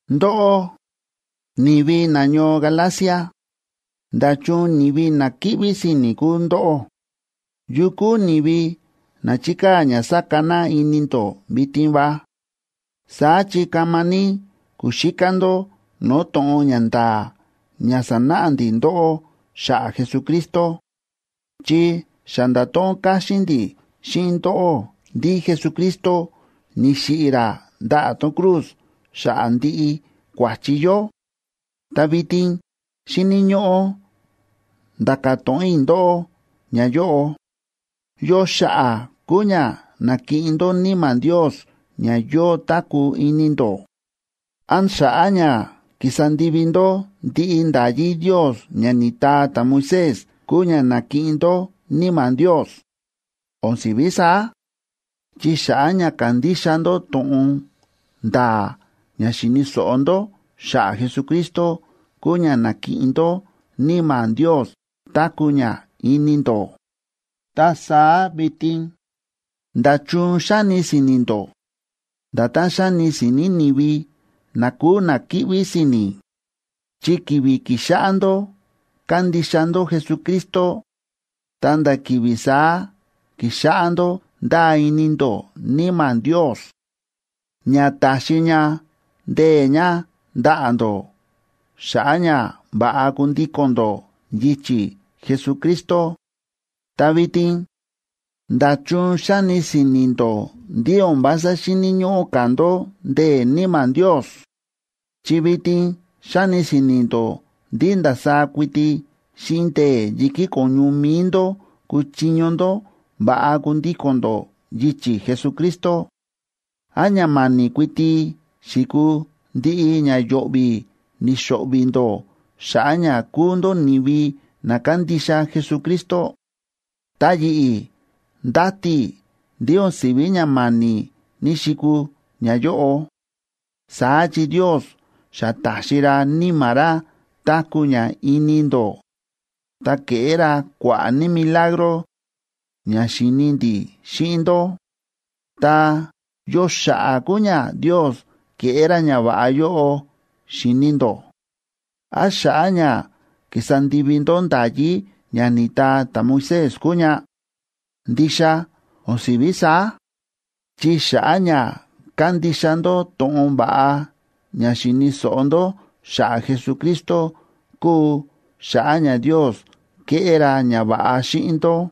Ndóꞌó, ni̱vi nañoo Galacia, ¡nda̱chun ni̱vi na kíꞌví si̱ni̱ kúu ndóꞌó! ¿Yu kúu ni̱vi na chi̱kaa̱ ña sa̱ka na ini ndó vitin va? Saá chi kama ní ku̱xíká ndó no̱o̱ to̱ꞌon ña nda̱a̱ ña sa̱náꞌa ndi̱ ndóꞌó xa̱ꞌa̱ Jesucristo, chi xa nda̱to̱ꞌon káxín ndi̱ xíꞌin ndóꞌó ndí Jesucristo ni̱xiꞌi̱ ra ndaꞌa̱ tón cruz xa̱ꞌa̱ ndiꞌi kua̱chi yó. Ta vitin xíni̱ ñóꞌó nda̱ka̱ to̱ꞌon i̱ ndóꞌó ñayóꞌo: ¿Yo xa̱ꞌa̱ kúu ña na̱kiꞌin ndó Níma̱ Ndios ña yóo táku̱ ini ndó? ¿Án xa̱ꞌa̱ ña ki̱sa ndivi ndó ndiꞌi nda̱yí Ndios ña ni̱taa ta̱Moisés kúu ña na̱kiꞌin ndó Níma̱ Ndios? O̱n si̱ví saá, chi xa̱ꞌa̱ ña ka̱ndixa ndó to̱ꞌon nda̱a̱ ña xi̱ni̱ so̱ꞌo ndó xa̱ꞌa̱ Jesucristo kúu ña na̱kiꞌin ndó Níma̱ Ndios táku̱ ña ini ndó. Ta saá vitin, ¿nda̱chun xáni si̱ni̱ ndó nda̱tán xáni si̱ni̱ ni̱vi na kúu na kíꞌví si̱ni̱? Chi ki̱vi̱ ki̱xáꞌá ndó kándixa ndó Jesucristo, ta nda̱ ki̱vi̱ saá ki̱xáꞌá ndó ndáa ini ndó Níma̱ Ndios ña taxi ña ndee̱ ña ndaꞌa̱ ndó xa̱ꞌa̱ ña va̱ꞌa kundíko̱n ndó yichi̱ Jesucristo. Ta vitin, ¿nda̱chun xáni si̱ni̱ ndó ndí o̱n vása xíni̱ ñóꞌó ka̱ ndó ndee̱ Níma̱ Ndios?, chi vitin xáni si̱ni̱ ndó ndí ndasaá kuiti xíꞌin ndee̱ yi̱kí ko̱ñu mi̱i ndó kúchiño ndó va̱ꞌa kundíko̱n ndó yichi̱ Jesucristo. ¿Án ña ma̱ni̱ kuiti xi̱kuu ndiꞌi ña yo̱ꞌvi̱ ni̱xo̱ꞌvi̱ ndó xa̱ꞌa̱ ña kúu ndó ni̱vi na kándixa Jesucristo? Ta yi̱ꞌi̱ ndáti i̱ ndí o̱n si̱ví ña ma̱ni̱ ní‑xikuu ñayóꞌo. Saá chi Ndios xa ta̱xi ra Níma̱ ra táku̱ ña ini ndó, ta ke̱ꞌé ra kua̱ꞌa̱ ní milagro ña xi̱ni ndi̱ xíꞌin ndó. Ta, ¿yo xa̱ꞌa̱ kúu ña Ndios kéꞌé ra ñava̱ꞌa yóꞌo xi̱ni ndó? ¿Án xa̱ꞌa̱ ña kísa ndivi ndó nda̱yí ña ni̱taa ta̱Moisés kúu ña? ¡Ndixa o̱n si̱ví saá!, chi xa̱ꞌa̱ ña kándixa ndó to̱ꞌon va̱ꞌa ña xi̱ni̱ so̱ꞌo ndó xa̱ꞌa̱ Jesucristo kúu xa̱ꞌa̱ ña Ndios kéꞌé ra ñava̱ꞌa xíꞌin ndó.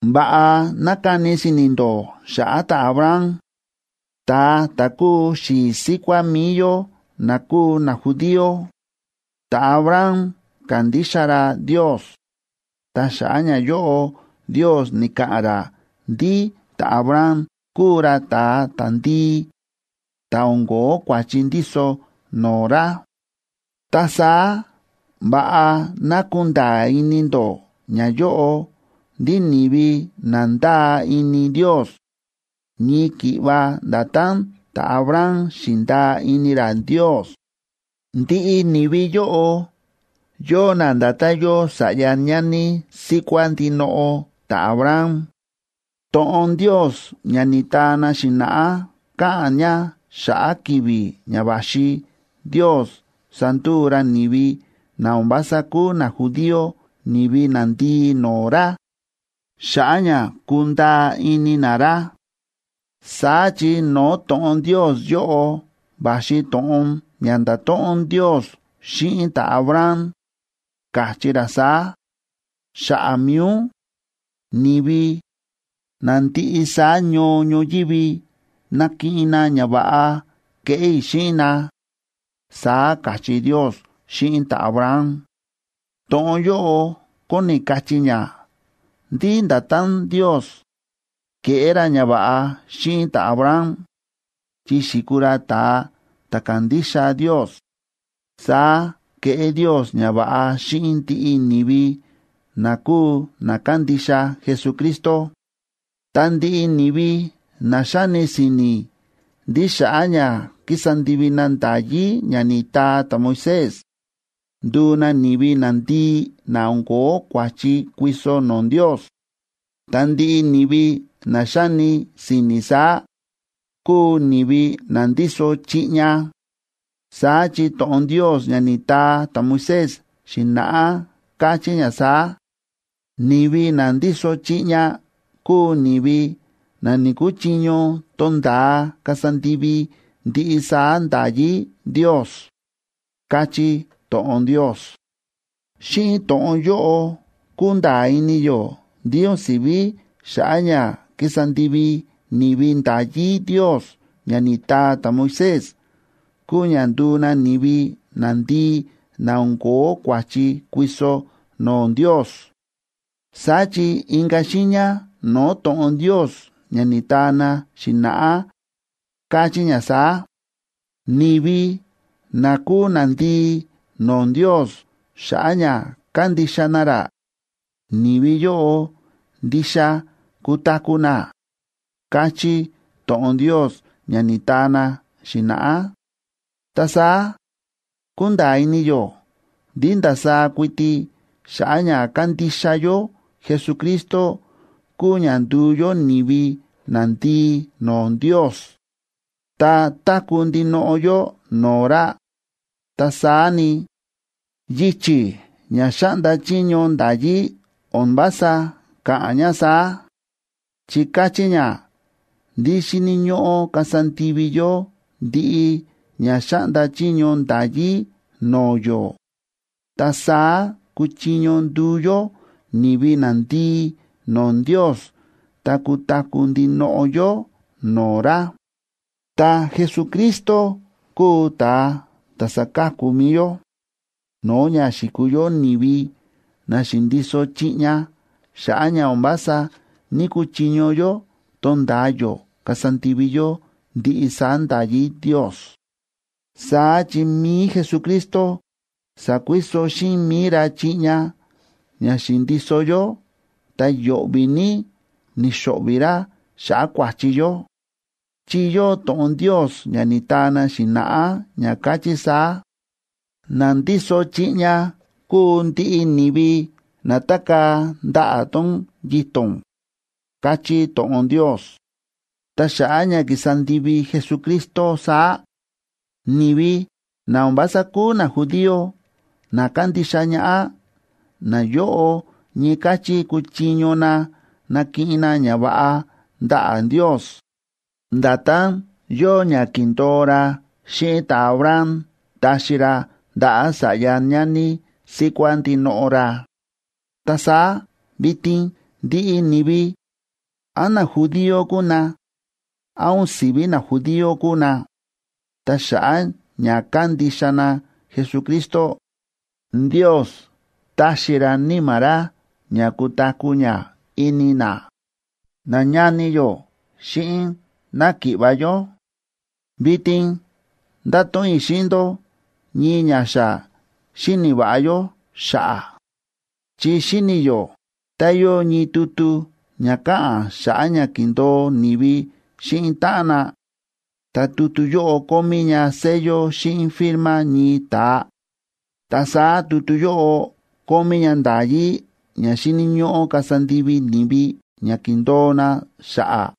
Va̱ꞌa ná kani si̱ni̱ ndó xa̱ꞌa̱ ta̱Abraham, ta̱a ta̱ kúu xi̱i̱ síkuá mi̱i yó na kúu najudío. Ta̱Abraham ka̱ndixa ra Ndios, ta xa̱ꞌa̱ ñayóꞌo Ndios ni̱ka̱ꞌa̱n ra ndí ta̱Abraham kúu ra ta̱a ta̱ndii ta̱ o̱n ko̱ó kua̱chi ndíso no̱o̱ ra. Ta saá, va̱ꞌa ná kunda̱a̱ ini ndó ñayóꞌo ndí ni̱vi na ndáa ini Ndios ñii ki̱ꞌva nda̱tán ta̱Abraham xi̱ndaa ini ra Ndios, ndiꞌi ni̱vi yóꞌo yóo na nda̱tán yóo sa̱ꞌya ñani síkuá ndinoꞌo ta̱Abraham. To̱ꞌon Ndios ña ni̱taa na xi̱na̱ꞌá káꞌa̱n ña xa̱ꞌa̱ ki̱vi̱ ña va̱xi Ndios sanduu ra ni̱vi na o̱n vása kúu najudío ni̱vi nandii no̱o̱ ra xa̱ꞌa̱ ña kundaa ini na ra. Saá chi no̱o̱ to̱ꞌon Ndios yóꞌo va̱xi to̱ꞌon ña nda̱to̱ꞌon Ndios xíꞌin ta̱Abraham, káchí ra saá: “Xa̱ꞌa̱ mi̱i ún, ni̱vi na ndiꞌi saá ñoo ñoyívi nakiꞌin na ñava̱ꞌa keꞌé i̱ xíꞌin na”, saá káchí Ndios xíꞌin ta̱Abraham. To̱ꞌon yóꞌo kóni kachí ña ndí nda̱tán Ndios ke̱ꞌé ra ñava̱ꞌa xíꞌin ta̱Abraham, chi xi̱kuu ra ta̱a ta̱ ka̱ndixa Ndios, saá kéꞌé Ndios ñava̱ꞌa xíꞌin ndiꞌi ni̱vi na kúu na kándixa Jesucristo. Ta ndiꞌi ni̱vi na xáni si̱ni̱ ndí xa̱ꞌa̱ ña kísa ndivi na nda̱yí ña ni̱taa ta̱Moisés, nduu na ni̱vi nandii na o̱n ko̱ó kua̱chi kuiso no̱o̱ Ndios, ta ndiꞌi ni̱vi na xáni si̱ni̱ saá kúu ni̱vi na ndíso chiꞌña. Saá chi to̱ꞌon Ndios ña ni̱taa ta̱Moisés xi̱na̱ꞌá káchí ña saá: “Ni̱vi na ndíso chiꞌña kúu ni̱vi na ni̱‑kuchiño tonda̱a kasa ndivi ndiꞌi saá nda̱yí Ndios”, káchí to̱ꞌon Ndios. Xíꞌin to̱ꞌon yóꞌo kúnda̱a̱ ini yó ndí o̱n si̱ví xa̱ꞌa̱ ña kísa ndivi ni̱vi nda̱yí Ndios ña ni̱taa ta̱Moisés kúu ña nduu na ni̱vi nandii na o̱n ko̱ó kua̱chi kuiso no̱o̱ Ndios. Saá chi inka̱ xiiña no̱o̱ to̱ꞌon Ndios ña ni̱taa na xi̱na̱ꞌá, káchí ña saá: “Ni̱vi na kúu nandii no̱o̱ Ndios xa̱ꞌa̱ ña kándixa na ra, ni̱vi yóꞌo, ndixa kutaku̱ na”, káchí to̱ꞌon Ndios ña ni̱taa na xi̱na̱ꞌá. Ta saá kúnda̱a̱ ini yó ndí ndasaá kuiti xa̱ꞌa̱ ña kándixa yó Jesucristo kúu ña ndu̱u yó ni̱vi nandii no̱o̱ Ndios ta táku̱ ndinoꞌo yó no̱o̱ ra. Ta saá ni, yichi̱ ña xáꞌnda chiño nda̱yí o̱n vása káꞌa̱n ña saá, chi káchí ña ndí xíni̱ ñóꞌó kasa ndivi yó ndiꞌi ña xáꞌnda chiño nda̱yí no̱o̱ yó, ta saá kuchiño nduu yó ni̱vi nandii no̱o̱ Ndios ta kutaku̱ ndinoꞌo yó no̱o̱ ra. Ta Jesucristo kúu ta̱a ta̱ sa̱ka̱ku mi̱i yó no̱o̱ ña xi̱kuu yó ni̱vi na xi̱ndiso chiꞌña xa̱ꞌa̱ ña o̱n vása ní‑kuchiño yó tonda̱a yó kasa ndivi yó ndiꞌi saá nda̱yí Ndios. Saá chi mi̱i Jesucristo sa̱kuiso xíꞌin mi̱i ra chiꞌña ña xi̱ndiso yó ta yo̱ꞌvi̱ ní ni̱xo̱ꞌvi̱ ra xa̱ꞌa̱ kua̱chi yó. Chi yóo to̱ꞌon Ndios ña ni̱taa na xi̱na̱ꞌá ña káchí saá: “Na ndíso chiꞌña kúu ndiꞌi ni̱vi na tákaa̱ ndaꞌa̱ tón yito̱n”, káchí to̱ꞌon Ndios. Ta xa̱ꞌa̱ ña ki̱sa ndivi Jesucristo saá, ni̱vi na o̱n vása kúu najudío na kándixa ñaꞌá, nayóꞌo ñii káchí kúchiño na nakiꞌin na ñava̱ꞌa ndaꞌa̱ Ndios, nda̱tán yóo ña ki̱ndo̱o ra xíꞌin ta̱Abraham taxi ra ndaꞌa̱ sa̱ꞌya ñani síkuá ndinoꞌo ra. Ta saá vitin ndiꞌi ni̱vi, án najudío kúu na, án o̱n si̱ví najudío kúu na, ta xa̱ꞌa̱ ña kándixa na Jesucristo, Ndios táxi ra Níma̱ ra ña kutaku̱ ña ini na. Nañani yó xíꞌin náki̱ꞌva̱ yó, vitin ndáto̱ꞌon i̱ xíꞌin ndó ñii ña xa xíni̱ va̱ꞌa yó xa̱ꞌa̱. Chi xíni̱ yó tá yóo ñii tutu ña káꞌa̱n xa̱ꞌa̱ ña ki̱ndo̱o ni̱vi xíꞌin táꞌan na, ta tutu yóꞌo kómí ña sello xíꞌin firma ñii ta̱a, ta saá tutu yóꞌo kómí ña nda̱yí ña xíni̱ ñóꞌó kasa ndivi ni̱vi ña ki̱ndo̱o na xa̱ꞌa̱.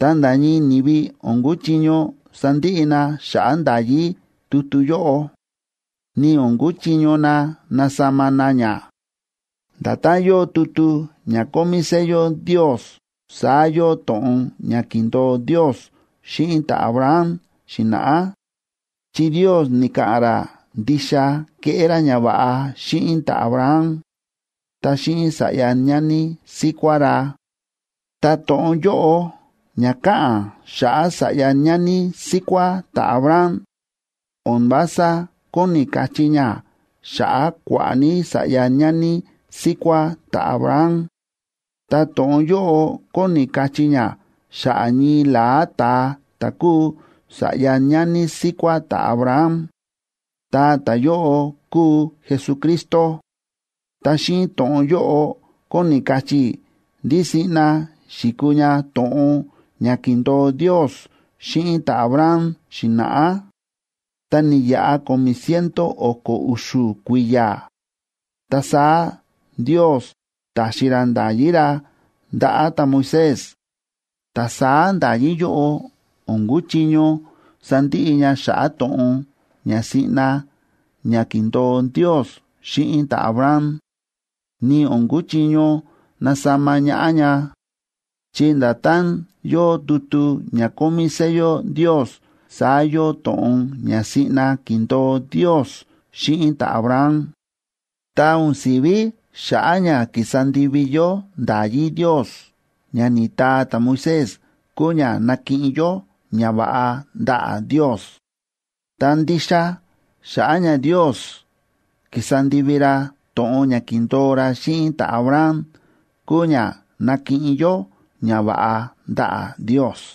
Ta nda̱ ñii ni̱vi o̱n kúchiño sandiꞌi na xa̱ꞌa̱ nda̱yí tutu yóꞌo, ni o̱n kúchiño na nasama na ña. Nda̱tán yóo tutu ña kómí sello Ndios, saá yóo to̱ꞌon ña ki̱ndo̱o Ndios xíꞌin ta̱Abraham xi̱na̱ꞌá, chi Ndios ni̱ka̱ꞌa̱n ra ndixa keꞌé ra ñava̱ꞌa xíꞌin ta̱Abraham ta xíꞌin sa̱ꞌya ñani síkuá ra. Ta to̱ꞌon yóꞌo ña káꞌa̱n xa̱ꞌa̱ sa̱ꞌya ñani síkuá ta̱Abraham o̱n vása kóni kachí ña xa̱ꞌa̱ kua̱ꞌa̱ ní sa̱ꞌya ñani síkuá ta̱Abraham, ta to̱ꞌon yóꞌo kóni kachí ña xa̱ꞌa̱ ñii la̱á ta̱a ta̱ kúu sa̱ꞌya ñani síkuá ta̱Abraham, ta ta̱yóꞌo kúu Jesucristo. Ta xíꞌin to̱ꞌon yóꞌo kóni kachí i̱ ndí siꞌna xi̱kuu ña to̱ꞌon ña ki̱ndo̱o Ndios xíꞌin ta̱Abraham xi̱na̱ꞌá. Ta ni̱yaꞌa ko̱mi̱ ciento o̱ko̱ u̱xu̱ kui̱ya̱, ta saá Ndios ta̱xi ra nda̱yí ra ndaꞌa̱ ta̱Moisés. Ta saá nda̱yí yóꞌo o̱n kúchiño sandiꞌi ña xa̱ꞌa̱ to̱ꞌon ña siꞌna ña ki̱ndo̱o Ndios xíꞌin ta̱Abraham, ni o̱n kúchiño nasama ñaꞌá ña, chi nda̱tán yóo tutu ña kómí sello Ndios, saá yóo to̱ꞌon ña siꞌna ki̱ndo̱o Ndios xíꞌin ta̱Abraham. Ta o̱n si̱ví xa̱ꞌa̱ ña ki̱sa ndivi yó nda̱yí Ndios ña ni̱taa ta̱Moisés kúu ña nakiꞌin yó ñava̱ꞌa ndaꞌa̱ Ndios. Ta ndixa xa̱ꞌa̱ ña Ndios ki̱sa ndivi ra to̱ꞌon ña ki̱ndo̱o ra xíꞌin ta̱Abraham kúu ña nakiꞌin yó ñava̱ꞌa ndaꞌa̱ Ndios.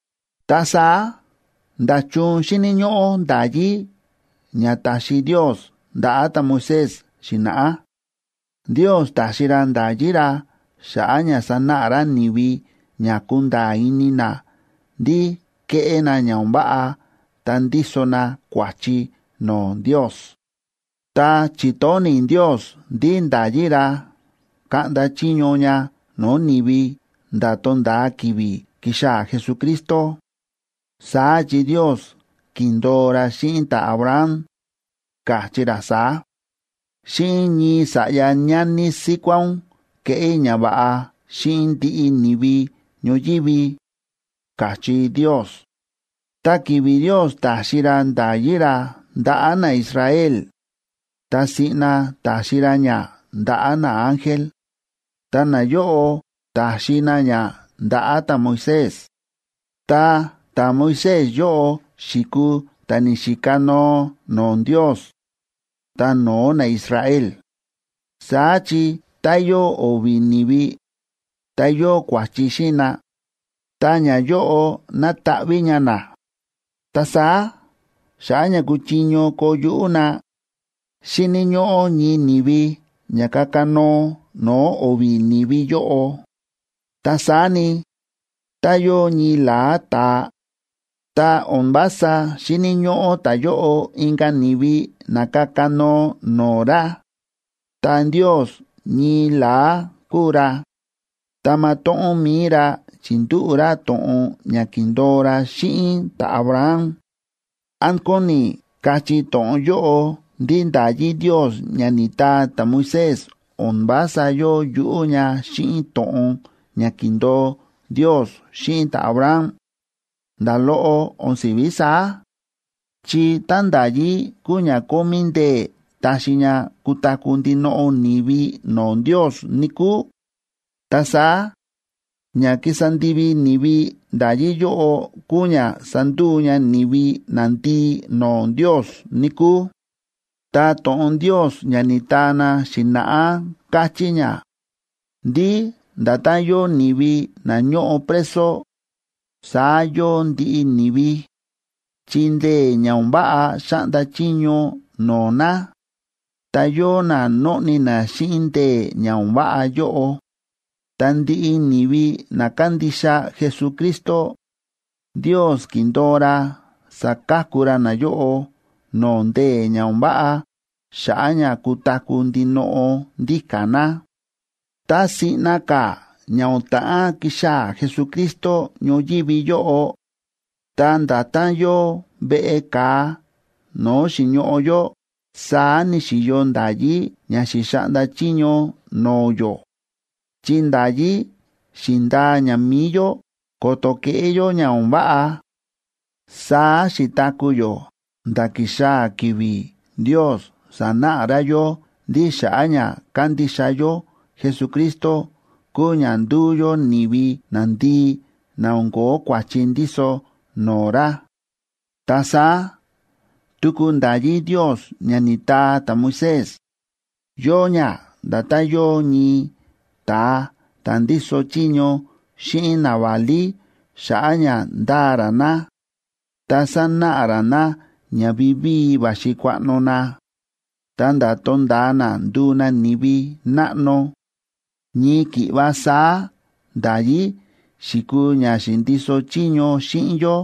Ta saá, ¿nda̱chun xíni̱ ñóꞌó nda̱yí ña ta̱xi Ndios ndaꞌa̱ ta̱Moisés xi̱na̱ꞌá? Ndios ta̱xi ra nda̱yí ra xa̱ꞌa̱ ña sanáꞌa ra ni̱vi ña kunda̱a̱ ini na ndí kéꞌé na ña o̱n váꞌa ta ndíso na kua̱chi no̱o̱ Ndios. Ta chi̱tóni̱ Ndios ndí nda̱yí ra kaꞌnda chiño ña no̱o̱ ni̱vi nda̱ to̱nda̱a ki̱vi̱ kixaa̱ Jesucristo. Saá chi Ndios ki̱ndo̱o ra xíꞌin ta̱Abraham, ka̱chí ra saá: “Xíꞌin ñii sa̱ꞌya ñani síkuá ún keꞌé i̱ ñava̱ꞌa xíꞌin ndiꞌi ni̱vi ñoyívi”, ka̱chí Ndios. Ta ki̱vi̱ Ndios ta̱xi ra nda̱yí ra ndaꞌa̱ naIsrael, ta siꞌna ta̱xi ra ña ndaꞌa̱ naángel, ta nayóꞌo ta̱xi na ña ndaꞌa̱ ta̱Moisés. Ta ta̱Moisés yóꞌo xi̱kuu ta̱ ni̱xikanoo no̱o̱ Ndios ta no̱o̱ naIsrael. Saá chi tá yóo o̱vi̱ ni̱vi, ta yóo kua̱chi xíꞌin na, ta ñayóꞌo nátaꞌví ña na. Ta saá xa̱ꞌa̱ ña kuchiño koo yuꞌú na, xíni̱ ñóꞌó ñii ni̱vi ña kakanoo no̱o̱ o̱vi̱ ni̱vi yóꞌo. Ta saá ni, tá yóo ñii la̱á ta̱a, ta o̱n vása xíni̱ ñóꞌó ta̱yóꞌo inka̱ ni̱vi na kakanoo no̱o̱ ra. Ta Ndios ñii la̱á kúu ra, ta matóꞌón mi̱i ra chi̱ndúꞌu̱ ra to̱ꞌon ña ki̱ndo̱o ra xíꞌin ta̱Abraham. ¿Án kóni kachí to̱ꞌon yóꞌo ndí nda̱yí Ndios ña ni̱taa ta̱Moisés o̱n vása yóo yuꞌú ña xíꞌin to̱ꞌon ña ki̱ndo̱o Ndios xíꞌin ta̱Abraham? ¡Nda̱ loꞌo o̱n si̱ví saá! Chi tá nda̱yí kúu ña kómí ndee̱ taxi ña kutaku̱ ndinoꞌo ni̱vi no̱o̱ Ndios, níkúu, ta saá ña kísa ndivi ni̱vi nda̱yí yóꞌo kuu ña sánduu ña ni̱vi nandii no̱o̱ Ndios, níkúu. Ta to̱ꞌon Ndios ña ni̱taa na xi̱na̱ꞌá káchí ña ndí nda̱tán yóo ni̱vi na ñóꞌo preso, saá yóo ndiꞌi ni̱vi, chi ndee̱ ña o̱n váꞌa xáꞌnda chiño no̱o̱ na, ta yóo na nóꞌni na xíꞌin ndee̱ ña o̱n váꞌa yóꞌo. Ta ndiꞌi ni̱vi na kándixa Jesucristo, Ndios ki̱ndo̱o ra saka̱ku ra nayóꞌo no̱o̱ ndee̱ ña o̱n váꞌa, xa̱ꞌa̱ ña kutaku̱ ndinoꞌo ndíka̱ na. Ta siꞌna ka̱ ña o̱n ta̱ꞌán kixaa̱ Jesucristo ñoyívi yóꞌo, ta nda̱tán yóo veꞌe ka̱a no̱o̱ xi̱ñoꞌo yó, saá ni̱xi̱yo nda̱yí ña xi̱xaꞌnda chiño no̱o̱ yó, chi nda̱yí xi̱ndaa ña mi̱i yó ko̱to̱ keꞌé yó ña o̱n váꞌa. Saá xi̱taku̱ yó, nda̱ ki̱xaa̱ ki̱vi̱ Ndios sa̱náꞌa ra yó ndí xa̱ꞌa̱ ña kándixa yó Jesucristo kúu ña ndúu yó ni̱vi nandii na o̱n ko̱ó kua̱chi ndíso no̱o̱ ra. Ta saá tuku nda̱yí Ndios ña ni̱taa ta̱Moisés, yóo ña nda̱tán yóo ñii ta̱a ta̱ ndíso chiño xíꞌin naválí xa̱ꞌa̱ ña ndaa ra na, ta sanáꞌa ra na ña vivíi va̱xi kuaꞌno na, ta̱nda̱ tonda̱a na nduu na ni̱vi náꞌno. Ñii ki̱ꞌva saá nda̱yí xi̱kuu ña xi̱ndiso chiño xíꞌin yó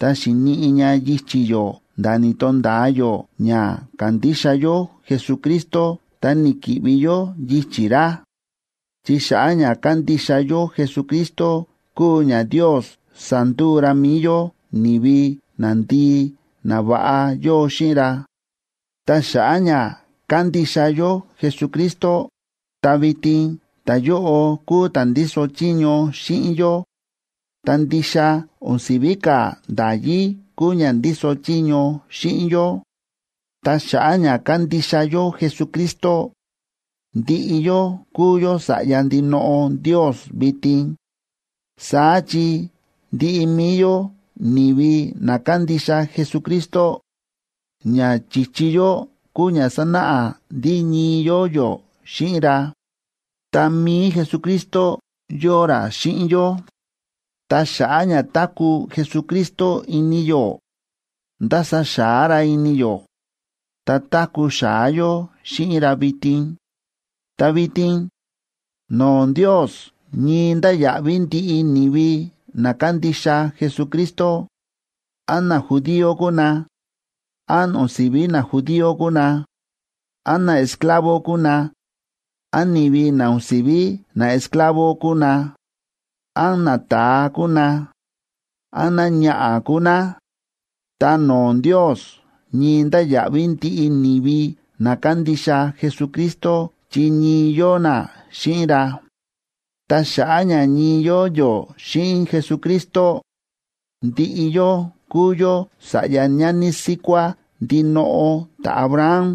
ta xi̱niꞌi ña yichi̱ yó nda̱ ni̱to̱nda̱a yó ña ka̱ndixa yó Jesucristo ta ni̱ki̱ꞌvi yó yichi̱ ra. Chi xa̱ꞌa̱ ña kándixa yó Jesucristo kúu ña Ndios sa̱nduu ra mi̱i yó ni̱vi nandii na va̱ꞌa yóo xíꞌin ra. Ta xa̱ꞌa̱ ña kándixa yó Jesucristo, ta vitin ta̱yóꞌo kúu ta̱ ndíso chiño xíꞌin yó, ta ndixa o̱n si̱ví ka̱ nda̱yí kúu ña ndíso chiño xíꞌin yó. Ta xa̱ꞌa̱ ña kándixa yó Jesucristo, ndiꞌi yó kúu yó sa̱ꞌya ndinoꞌo Ndios vitin. Saá chi ndiꞌi mi̱i yó ni̱vi na kándixa Jesucristo, ña chi̱chi yó kúu ña sánáꞌa ndí ñii yóo yó xíꞌin ra, ta mi̱i Jesucristo yóo ra xíꞌin yó. Ta xa̱ꞌa̱ ña táku̱ Jesucristo ini yó, nda̱sa xa̱á ra ini yó, ta táku̱ xa̱á yó xíꞌin ra vitin. Ta vitin, no̱o̱ Ndios ñii ndáya̱ꞌví ndiꞌi ni̱vi na kándixa Jesucristo; án najudío kúu na, án o̱n si̱ví najudío kúu na, án naesclavo kúu na,a án ni̱vi na o̱n si̱ví naesclavo kúu na, án nata̱a kúu na, án náñaꞌa̱ kúu ná, ta no̱o̱ Ndios ñii ndáya̱ꞌví ndiꞌi ni̱vi na kándixa Jesucristo chi ñii yóo na xíꞌin ra. Ta xa̱ꞌa̱ ña ñii yóo yó xíꞌin Jesucristo, ndiꞌi yó kúu yó sa̱ꞌya ñani síkuá ndinoꞌo ta̱Abraham,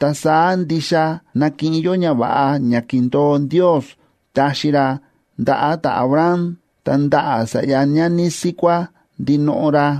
ta saá ndixa nakiꞌin yó ñava̱ꞌa ña ki̱ndo̱o Ndios taxi ra ndaꞌa̱ ta̱Abraham ta ndaꞌa̱ sa̱ꞌya ñani síkuá ndinoꞌo ra.